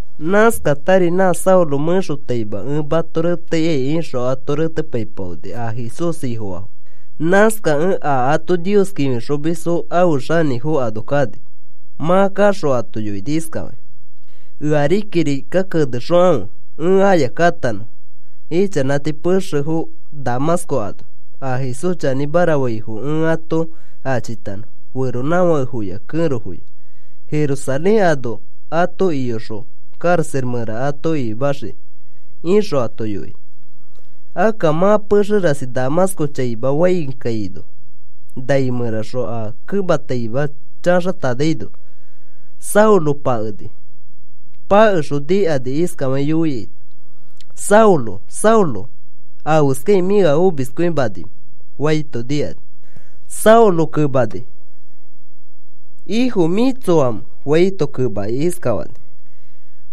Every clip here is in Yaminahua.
Nãskatari nã Saulo mẽxotaima ẽ mato reteikai ixõ ato retepaipaoni a Jesús Ifofaafo. Nãskakẽ a ato Nios kĩfixomisfo ãfe xanĩfo ano kani. Mã kaxõ ato yoini iskafakĩ: “Ea kirika kenexokãfe ẽ aya katanõ, ichanãti pexefo Damasco ano a Jesús chanĩmara faifo ẽ ato achitanõ, feronãfakefoya kẽrofoya, Jerusalén ano ato iyoxõ karaxa mẽra ato ikimaxiki,” ixõ ato yoini. Akka mã pexe rasi Damasco chaima fãi kaino, nai mẽraxõ a kemataima chaxatanaino, Saulo pakeni. Pakexõ nikani, iskafakĩ yoiaito: “Saulo, Saulo, ¿afeskakĩ mĩ ea omiskõimanimẽ?” faito nikakĩ, Saulo kemani: “Ifo, ¿mĩ tsoamẽ?” faito kemakĩ iskafani: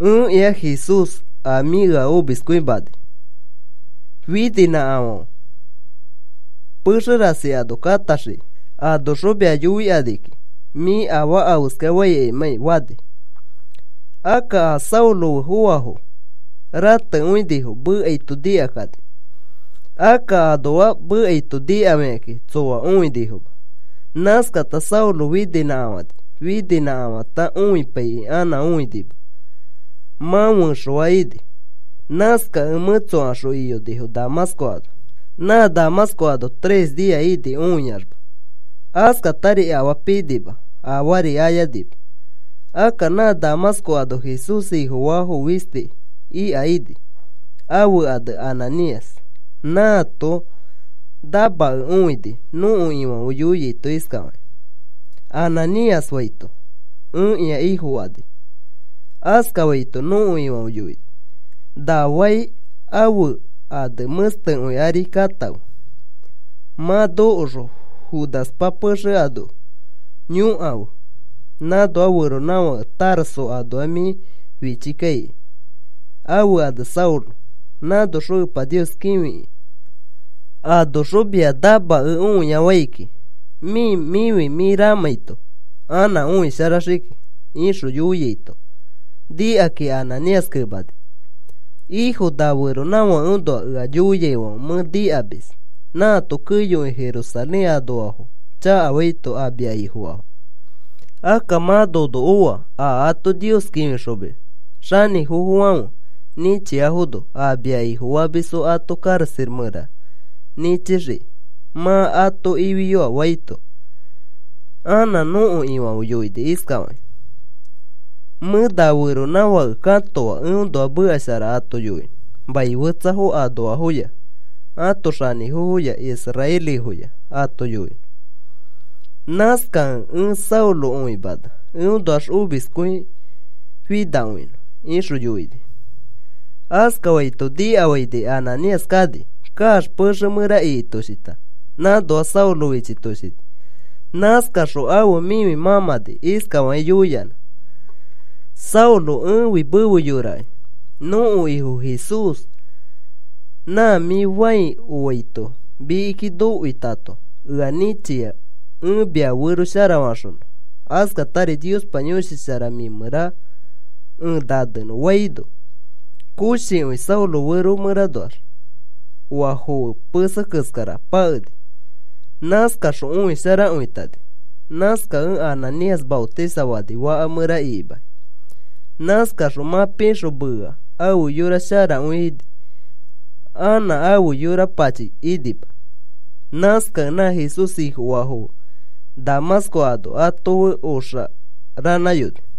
“Ẽkĩa Jesús, a mĩ ea omiskõimanai. Fininãkafã. Pexe rasi ano katãxiki. Anoxõ mia yoikani kiki mĩ afaa afeska faimãkai,” fani. Akka a Saulo fe foaifo ratekõinifo mekaito nikakani. Akka anoa mekaito nikafikakĩ tsoa õinifoma. Nãskata Saulo fininãkafani. Fininãkafãta õipaikĩ anã õinima, mã fẽxoa ini. Nãskakẽ mẽtsokaxõ iyonifo Damasco ano. Nã Damasco ano tres nia ini õiaxma. Askatari afaa pinima, afaari ayanima. Akka nã Damasco ano Jesús Ifofaa fisti ika ini, ãfe ane Ananías. Nãato namakẽ õini nõko Ifãfe yoiaito iskafakĩ: “Ananías,” faito, “Ẽkĩa, Ifo,” fani. Askafaito nõko Ifãfe yoini: “Na fai ãfe ane ‘Mẽstekõi’ ari katãfe. Mã nokoxõ Judaspa pexe ano yõkafe nãnoa feronãfake Tarso anoa, mĩ fichikai ãfe ane Saulo. Nãnoxõ Epa Nios kĩfi kiki. Anoxõ mia namakẽ õiafai kiki, mĩ mĩfi mĩ mãmãito, anã õisharaxiki,” ixõ yoiaito, nikakĩ Ananías kemani: “Ifo, na feronãfakeõnoa ea yoiaifãfe mẽ nikamis. Nãato keyokõi Jerusalén anoafo chakafaito a mia Ifofaafo. Akka mã nono oa a ato Nios kĩfixomis xanĩfofofãfe nĩchiafono. A mia Ifofamisfo ato karaxa mẽra nĩchixikĩ mã ato ifiyoa,” faito, anã nõko Ifãfe yoini iskafakĩ: “Mẽ na feronãfake katoa eõnoa meka shara ato yoinõ mai fetsafo anoafoya ãto xanĩfofoya israelifoya ato yoinõ. Nãskakẽ ẽ Saulo õimana eõnoax omiskõifinakõinõ,” ixõ yoini. Askafaito nikafaini Ananías kani. Kaax pexe mẽra ikitoshita nãnoa Saulo fichitoshini. Nãskaxõ ãfe mĩfi mãmãni iskafakĩ yoiyanã: “Saulo, ẽfi mefe yorakĩ. Nõko Ifo Jesús nã mĩ fãi oaito mikiki nokoitato, ea nĩchia ẽ mia fero sharafaxonõ, askatari Niospa Yõshi Shara mĩ mẽra ẽ nanenõ,” faino, koshikõi Saulo fero mẽranoax oa foe pese keskara pakeni. Nãskaxõ õisharakõitani. Nãskakẽ Ananías maotisafani faka mẽra ikimakĩ. Nãskaxõ mã pixõ meea ãfe yora sharakõi ini, anã ãfe yora pachi inima. Nãskakẽ nã Jesús Ifofaafo fe Damasco ano ato fe oxa ranãyonifo.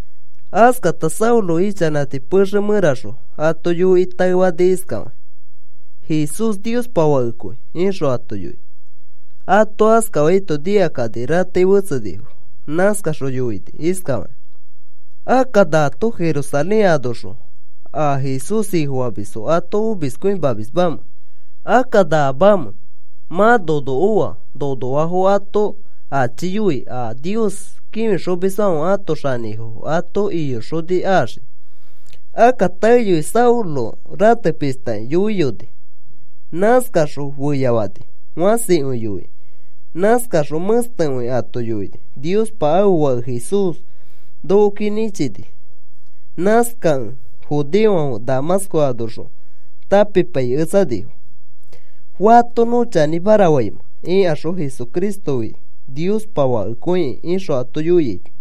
Askata Saulo ichanãti pexe mẽraxõ ato yoikĩ taefani iskafakĩ: “Jesús Niospa Fakekõi,” ixõ ato yoini. Ato askafaito nikakani ratei fetsenifo. Nãskaxõ yoinifo iskafakakĩ: “Akka, ¿nato Jerusalén anoxõ a Jesús Ifofamisfo ato omiskõimamismamẽ? Akka, ¿naamamẽ? Mã nono oa nonoafo ato achiyoi, a Nios kĩfixomisfãfe ãto xanĩfofo ato iyoxoni axiki.” Akka taeyoi Saulo ratepishtakĩ yoiyoni. Nãskaxõ feyafani fãsikõi yoikĩ. Nãskaxõ mẽstekõi ato yoini Niospa ãfe Fake Jesús nokoki nĩchini. Nãskakẽ judeofãfe Damasco anoxõ tãpipaiketsanifo. “¿Fato nõ chanĩmara faimẽ?” ikaxõ, “Jesucristofi Niospa Fakekõikĩ,” ixõ ato yoiaito.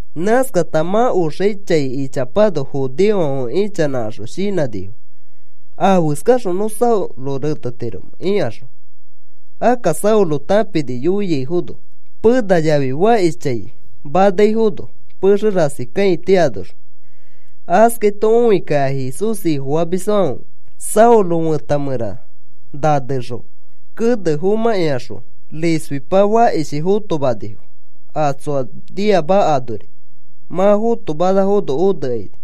Nãskata mã oxai ichapano, judeofãfe ichanãkaxõ shinãnifo: “¿Afeskaxõ nõ Saulo retetiromẽ?” ikaxõ, akka Saulo tãpini yoiaifono. Pena yafi fakishchãi manaifono pexe rasi kãiti anoxõ retepaikakĩ. Askaito õikakĩ a Jesús Ifofamisfãfe Saulo fẽta mẽra nanexõ kene fomãkĩaxõ risfichi fakishi fotomanifo a tsoa niama anori. Mã fotomanafono onekaini.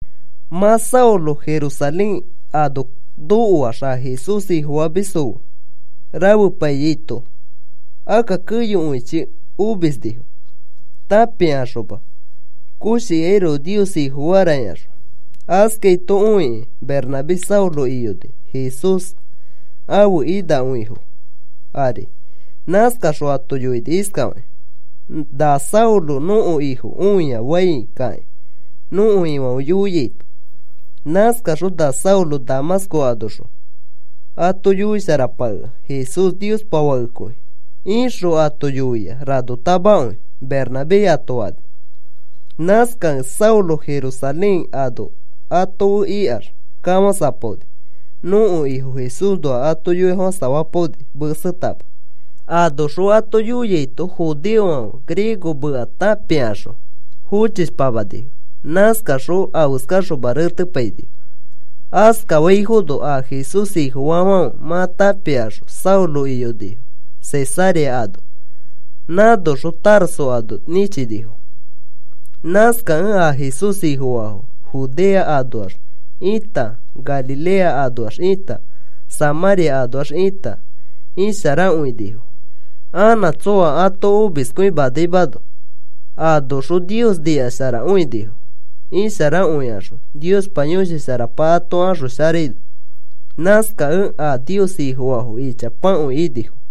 Mã Saulo Jerusalén ano nokoax a Jesús Ifofamisfo fe rafepaiyaito, akka keyokõichi omisnifo tãpikaxoma koshikairoko Nios Ifofara ikaxõ. Askaito õikĩ Bernabé Saulo iyoni Jesús ãfe inakõifo ari. Nãskaxõ ato yoini iskafakĩ: “Na Saulo nõko Ifo õia fãi kakĩ, nõko Ifãfe yoiaito. Nãskaxõ na Saulo Damasco anoxõ ato yoisharapakea, ‘Jesús Niospa Fakekõi,’ ixõ ato yoia ranotamakõi,” Bernabé ato fani. Nãskakẽ Saulo Jerusalén ano ato fe ikax, kafãsapaoni. Nõko Ifo Jesúsnoa ato yoifofãsafapaoni mesetama. Anoxõ ato yoiaito judeofãfe griego meka tãpikaxõ fochishpamanifo. Nãskakaxõ afeskaxoma retepainifo. Askafaifono a Jesús Ifofaafãfe mã tãpikaxõ Saulo iyonifo Cesarea ano. Nãnoxõ Tarso ano nĩchinifo. Nãskakẽ a Jesús Ifofaafo Judea anoax ita Galilea anoax ita Samãria anoax ita isharakõinifo anã tsõa ato omiskõimanaimano. Anoxõ Nios nikasharakõinifo isharakõikaxõ Niospa Yõshi Sharapa ato axosharaino. Nãskakẽ a Nios Ifofaafo ichapakõi inifo.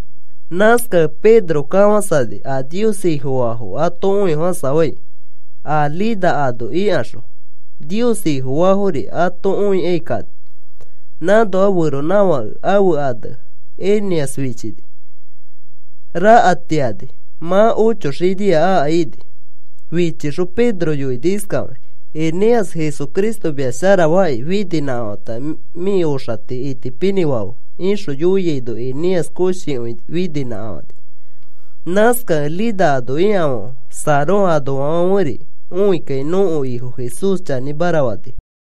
Nãskakẽ Pedro kafãsani a Nios Ifofaafo ato õifofãsafai. A Lida ano ikaxõ Nios Ifofaafori ato õikai kani. Nãnoa feronãfake ãfe ane Eneas fichini. Rakatiani mã ocho xinia aka ini. Fichixõ Pedro yoini iskafakĩ: “Eneas, Jesucristo mia sharafaaki fininãkafãta mĩ oxati itipinĩfafe,” ixõ yoiaino, Eneas koshikõi fininãkafani. Nãskakẽ Lida ano ikafãfe, Sarón anoafãferi õikakĩ nõko Ifo Jesús chanĩmara fanifo.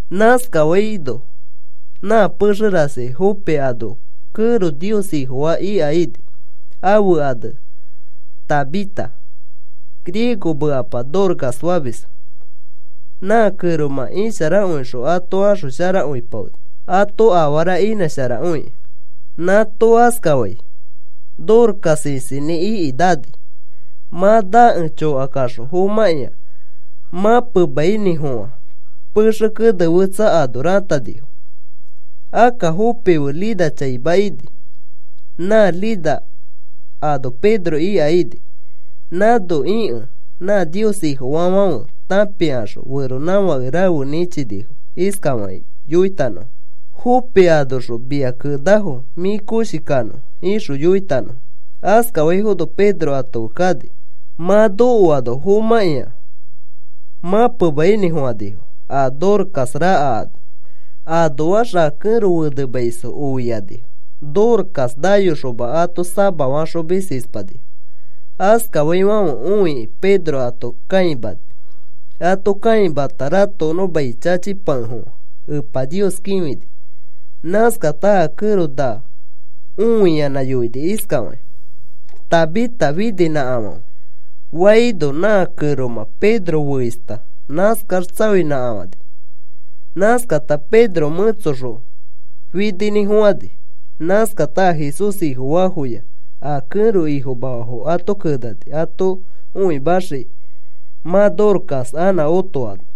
Nãskaifono nã pexe rasi Jope ano kẽro Nios Ifofaa ika ini, ãfe ane Tabita. Griego mekapa Dorcas famisfo. Nã kẽromã isharakõixõ ato axosharakõipaoni ato afara inãsharakõikĩ. Nãato askafai, Dorcas isinĩ iki nani. Mã nakẽ chokakaxõ fomãkĩa mãpemainĩfofã pexe kene fetsa ano ratanifo. Akka Jope fe Lida chaima ini. Nã Lida ano Pedro ika ini. Nãno ikẽ nã Nios Ifofaafãfe tãpikaxõ feronãfake rafe nĩchinifo, iskafakĩ yoitanõfo: “Jope anoxõ mia kenafo mĩ koshi kanõ,” ixõ yoitanõfo. Askafaifono Pedro ato fe kani. Mã nokoano fomãkĩa mãpemainĩfofãnifo a Dorcas raka ano. Anoax a kẽro fenemaisfo oiakakĩ Dorcas nayoxoma ato samafaxomis ispanifo. Askaifãfe õikĩ Pedro ato kãimani. Ato kãimata ratokonõ mai chachipakefofã Epa Nios kĩfini. Nãskata a kẽro naa õiyanã yoini iskafakĩ: “Tabita, fininãkafãfe,” faino, nã kẽromã Pedro feista nãskax tsaoinãkafãni. Nãskata Pedro mẽtsoxõ fininĩfofãni. Nãskata a Jesús Ifofaafoya a kẽro ifomafafo ato kenani ato õimaxiki mã Dorcas anã otoano.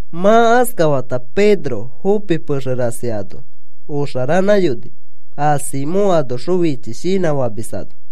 Mã askafata Pedro Jope pexe rasi ano oxaranãyoni, a Simón anoxõ fichi shinã famis ano.